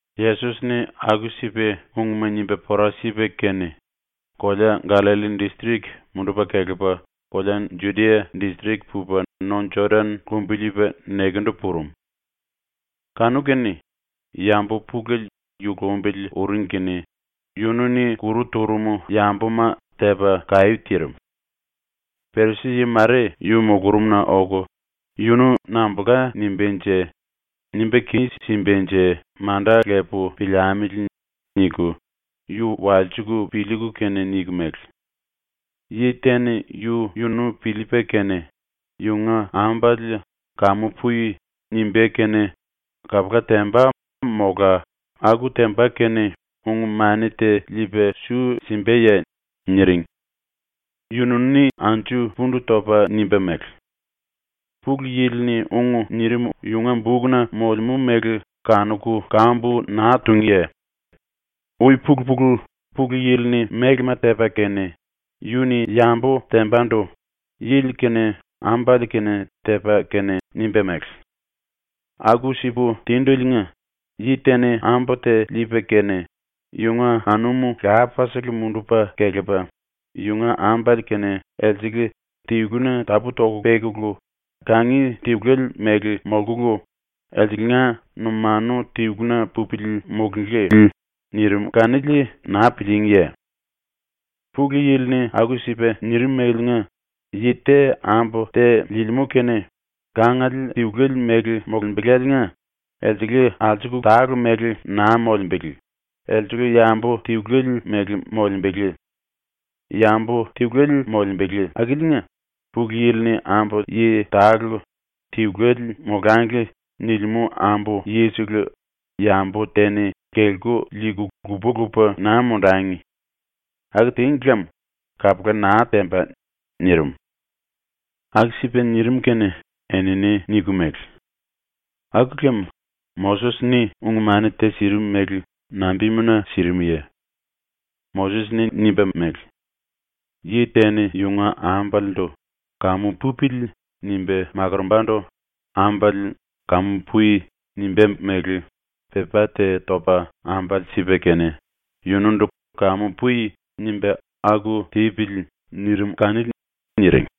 Yesos-ni aku-sipa ungma nimba pora sipa kene, kolea Gallalli distrik mundupa kelepa kolea Judia distrik pupa no Jodan lumbiliipa nekendu purum. Kanu-kene yambu pulele yu lumbili uring kene yunu-ni kuru turum yambuma tepa kaí tirim. Perisi-yi mare yu mulurumna oku ‘Yunu nambulka nimbánje? Nimba kis-simbanje manda lepu piliamili.’ niku yu walsiku piliiku kene niku mele: “Yi te-ni yu-yunu piliipa kene yunga ambale “Kamu pui.” nimbá kene kapula temba mola aku temba kene ung-mani te liipa su simbaye?” niring. Yunu-ni anju pundu topa nimba mele: “Pulu Yili-ni ung nirim yunga bukna molemú mele kanuku kambu naa túngiye? Ui-pulu-pulu, Pulu Yili-ni mélema tepa kene, yu-ni yambu tembandu yili kene ambale kene tepa kene nimba mele: “Aku-sipu tindeliinga yi te-ni ambu te liipa kene yunga anum lapasele mundupa kelepa yunga ambale kene elsele tiluna tapú-toku pekulu kangi tiluele mele ⸤molkulu elsengla numanu tiluna pupili⸥ mulunglí.” nirim kanili naa pilííngiye? Pulu Yili-ni aku-sipa nirimeliinga yi te ambu te liilimú kene kangiele tiluele mele molembeláliinga elsele alsuku tale mele naa molembele, elsele yambu tiluele mele molembele. Yambu tiluele molembele akiliinga Pulu Yili-ni ambu yi tale ‘Tiluele molangli.’ nilimú ambu yisele yambu te-ni kelku liiku lupa-lupa naa mundangi. Aku tíngi lem kapula naa temba.” nirim. Aku-sipa nirim kene enini niku mele: “Aku lem Moses-ni ung-mani te sirim mele nambimuna sirimuye? Moses-ni nimba mele: “Yi te-ni yunga ambalendu ‘Kamu pupili.’ nimba makorombandu ambale “Kamu pui.” nimbá mele pepá te topa ambale sipa kene yunundu “Kamu pui.” nimba aku tipili.” nirim kanili.” niring.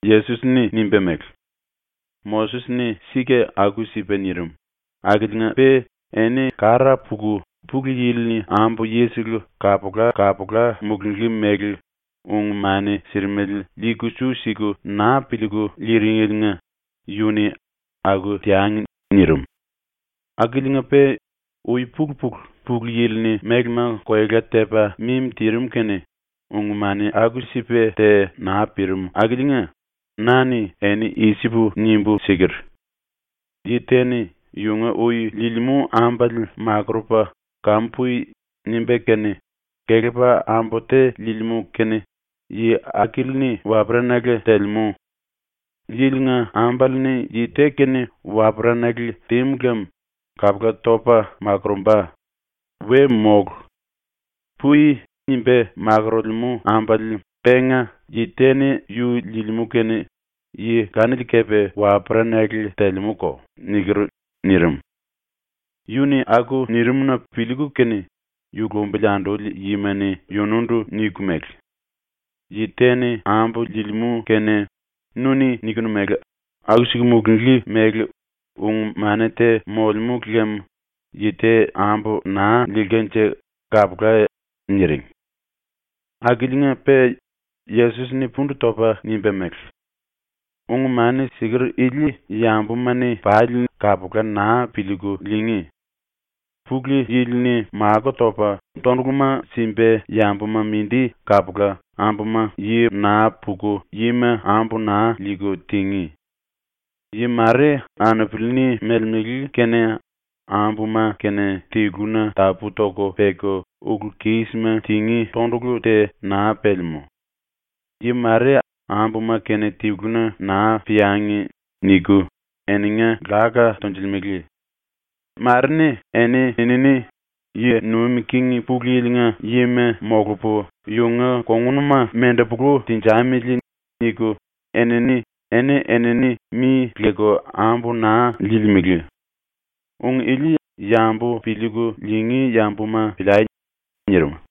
Yesos-ni nimba mele: “Moses-ni sika aku-sipa nirim akiliinga-pe eni kara puku Pulu Yili-ni ambu yisele kapula-kapula mulunglí mele ung-mani sirimele liiku su siku naa piliiku liiringeliinga yu-ni “Aku teangi.” nirim. Akiliinga-pe ui-pulu-pulu ⸤Pulu Yili-ni mélema koela tepa mimi tirim kene⸥, ung-mani aku-sipa te naa pirim akiliinga na-ni eni i-sipu nimbu siker: “Yi te-ni yunga ui liilimú ambale makurupa “Kamu pui.” nimba kene kelepa ambu te liilimú kene yi akili-ni waperanale telemú. Yili-nga ambale-ni yi te kene waperanale tímu lem kapula topa makurumba. We mólu. (“Pui.” nimba makorolemú ambale penga yi te-ni yu liilimú kene yi kanili kepe waperanale telemúko.)” niker.” nirim. ⸤Yu-ni aku nirim-na piliiku kene⸥ yu lumbili anduli yima-ni yunundu niku mele: “Yi te-ni ambu liilimú kene nu-ni nikinu mele aku-siku mulunglí mele ung-mani te molemú lem yi te ambu naa liilkanje kapula.” niring. Akiliinga-pe Yesos-ni pundu topa nimba mele: “Ung⸤-mani siker⸥ ili yambuma-ni pali kapula naa piliiku liingí. ⸤Pulu Yili-ni⸥ makó topa tonduluma simba yambuma mindi kapula ⸤ambuma yi naa puku yima ambu naa liiku⸥ tingí. Yi mare anupili-ni melemele kene ambuma kene tiluna tapú-toku peku ulu-kísima tingí tondulu te naa pelemú. Yi mare ‘Ambuma kene tiluna naa peangi.’ niku eninga láka tonjilimele. Mare-ni eni-enini ‘Yi nuim king Pulu Yili-nga yima molupu yunga kongunuma mendepulu tenjamili.’ niku enini eni-enini mi leku ambu naa liilimele. Ung ili yambu piliiku liingí yambuma piliai.” nirim.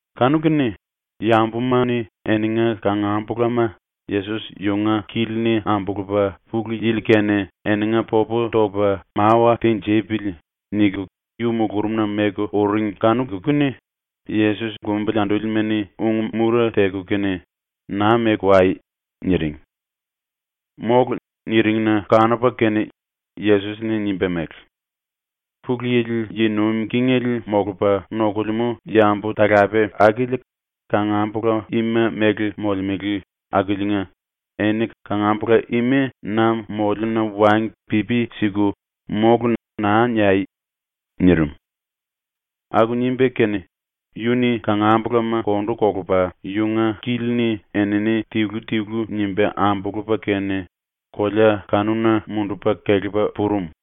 Kanu-kene yambuma-ni eninga kangambulama ‘Yesos yunga kili-ni ambulupa Pulu Yili-kene eninga popu toku mawa tinjipili.’ niku yu mulurumna meku uring kanuku kene Yesos lumbili andúlima-ni ung-mura teku kene ⸤“Naa meku wai.”⸥ niring. ⸤“Mólu.” niring-na⸥ kanupa kene Yesos-ni nimba mele: “Pulu Yili yi nuim kingele molupa nokulemú yambu-talape akili kangambula ima mele molemele akiliinga eni kangambula ima na moliuna wangi pipi siku “Mólu.” naa niai.” nirim. Aku nimba kene yu-ni kangambulama ⸤kondu kolupa⸥ yunga kili-ni enini tilu-tilu nimba ambulupa kene kolea kanuna mundupa kelepa purum.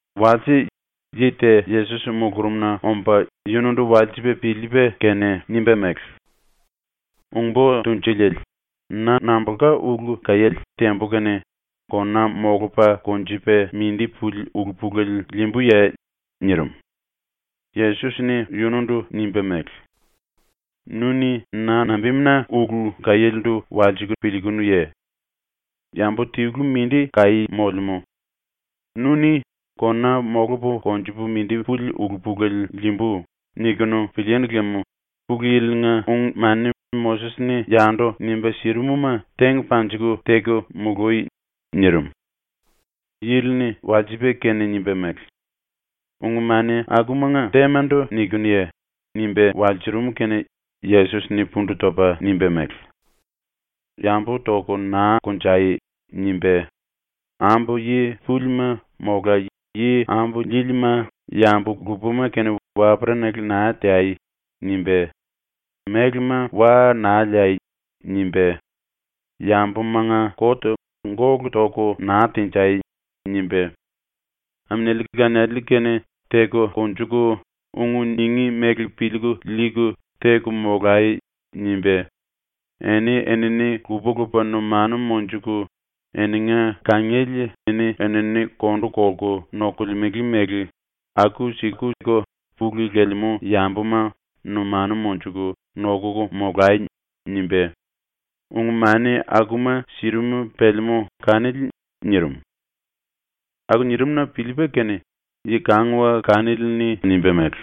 Walse yi te Yesos mulurumna omba yunundu walsipa piliipa kene nimba mele: “Ung-Bo Tunjuliele, na nambulka ulu kaiéle tembu kene kona molupa konjupa mindi puli ulu-pulele liimbuye?” nirim. Yesos-ni yunundu nimba mele: “Nu-ni na nambimuna ulu kaiélendu walsiku piliikunuye? Yambu tilu mindi kaí molemú. Nu-ni ‘kona molupu konjupu mindi puli ulu-pulele liimbu.’ nikunu pilíínu lem ⸤Pulu Yili-nga⸥ ung-mani ⸤Moses-ni yandu nimba sirim-ma⸥ teng panjiku teku mului.” nirim. Yili-ni walsipa kene nimba mele: “Ung-mani akumanga témandu nikinuye?” nimba walsurum kene Yesos-ni pundu topa nimba mele: “ “Yambu toku naa konjai.” nimba, “Ambu yi púlima mola yi ambu líílima yambu lupama kene waperanale naa teai.” nimba, “Mélema wa naa liai.” nimba, “Yambumanga kot gólu toku naa tenjai.” nimba, “Aminiali laniali kene teku konjuku, ung ningí mele piliiku liiku teku molai.” nimba, “eni-enini lupa-lupa numanu monjuku eninga kangiele eni-enini kondu kolku nokolemele mele aku-sikuko pulu lelemú yambuma numanu monjuku nokuku molai.” nimba, ung-mani akuma sirim pelemú kanili.” nirim. Aku nirim-na piliipa kene yi-kanguwa kanili-ni nimba mele: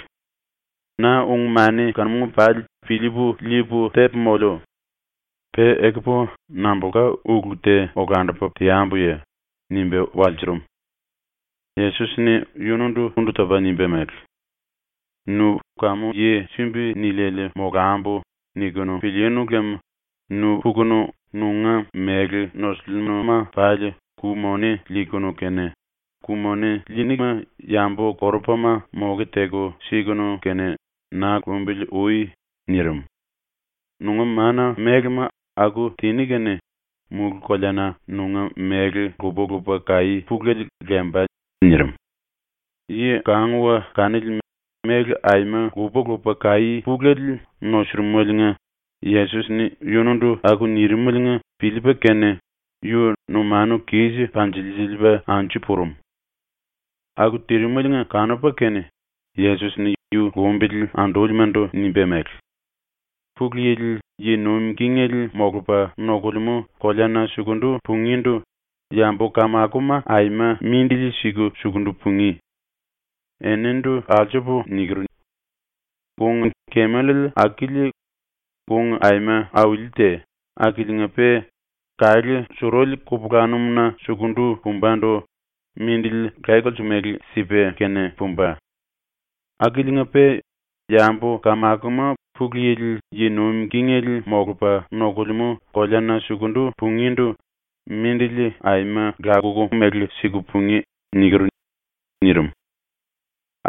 “Na ung-mani kanuma pali piliipu liipu tepu moliu. Pe ekupu nambulka ulu te olandupa teambuye?” nimba walsurum. Yesos-ni yunundu pundu topa nimba mele: “Nu ‘kamu yi sumbi niliele molambu.’ nikunu pilíínu lem nu pukunu nunga méle nosulluma pali ku-moni liikunu kene, ku-moni liiníma yambu-korupama moke teku sikunu kene na lumbili ui.” nirim. “Nunga ⸤mana-⸥mélema aku tiní kene mulú-koleana nunga méle lupa-lupa kaí pulele lemba.” nirim. Yi-kanguwa kanili méle aima lupa-lupa kaí pulele nosurumeliinga Yesos-ni yunundu aku nirimeliinga piliipa kene yu numanu kis panjilsiliipa anju purum. ⸤Aku tirimeliinga kanupa kene⸥ Yesos-ni yu lumbili andúlimandu nimba mele: “Pulu Yili yi nuim kingele molupa nokulemú koleana sukundu pungíndu yambu-kamakoma aima mindili siku sukundu pungí. Enindu alsupu niker: ‘Kung-kemel akili ⸤kung aima auli te akiliinga-pe⸥ kalé suruli kupulanum-na sukundu pumbandu mindili laye-kolse mele sipa kene pumba. Akiliinga-pe yambu-kamakoma Pulu Yili yi nuim kingele molupa nokulemú koleana sukundu pungíndu mindili aima lakuku mele siku pungí.’ niker.” nirim.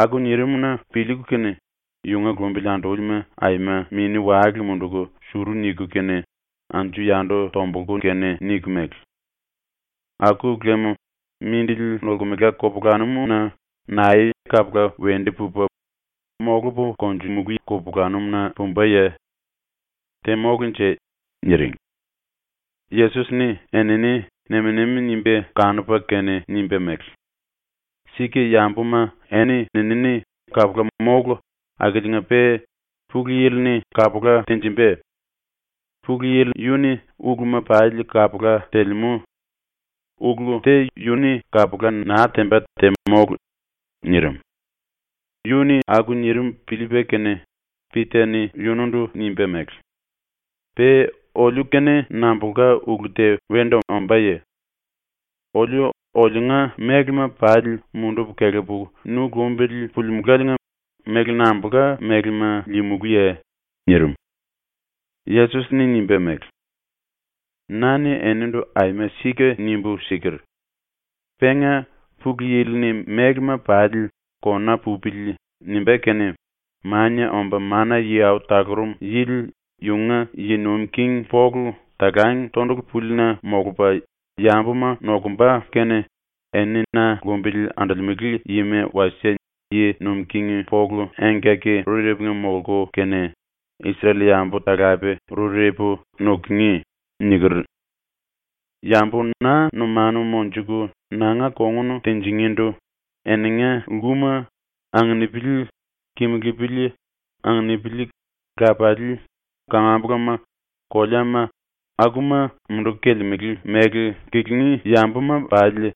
Aku nirim-na piliiku kene yunga lumbili andúlima aima mini-wale munduku suru niku kene anju-yandu tombulku kene niku mele: “Aku lem mindili nolkemela kupulanum-na nae kapula wendu pupa, molupu konjumulú kupulanum-na pumbaye? Te mólunje.” niring. Yesos-ni enini nem-nemi nimba kanupa kene nimba mele: “Sika yambuma eni-enini kapula mólu akiliinga-pe Pulu Yili-ni kapula tenjimba. Pulu Yili yu-ni uluma pali kapula telemú. Ulu te yu-ni kapula naa temba te mólu.” nirim. Yu-ni aku nirim piliipa kene Pita-ni yunundu nimba mele: “⸤Pe oliu-kene nambulka ulu te wendu ombáye?⸥ Oliu oliunga mélema pali mundupu kelepu nu lumbili pulimulaliinga méle nambulka mélema liimulúye?” nirim. Yesos-ni nimba mele: “Na-ni enindu aima sika nimbu siker: “Penga ⸤Pulu Yili-ni⸥ mélema pali ‘kona pupili.’ nimbá kene Mania Omba Mana-Yi Au Talurum Yili yunga yi nuim king polu talang tondulu púlina molupa yambuma nokumba kene, eni na lumbili andolemele yima wasie yi nuim king polu engkaki-rurepunga molku kene, Isrel-yambu talape rurepu nukungí.” niker. Yambu na numanu monjuku nanga kongun tinjingíndu eninga lkuma, anginipili, kimulupili, anupili, lapalii, kangambulama, koleama, akuma munduku kelemele ⸤mele kelengí⸥ yambuma pali,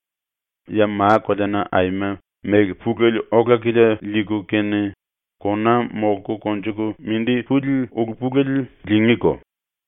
ya ma-koleana aima méle pulele ola-kilia liiku kene, kona molku konjuku mindi puli ulu-pulele liingíko.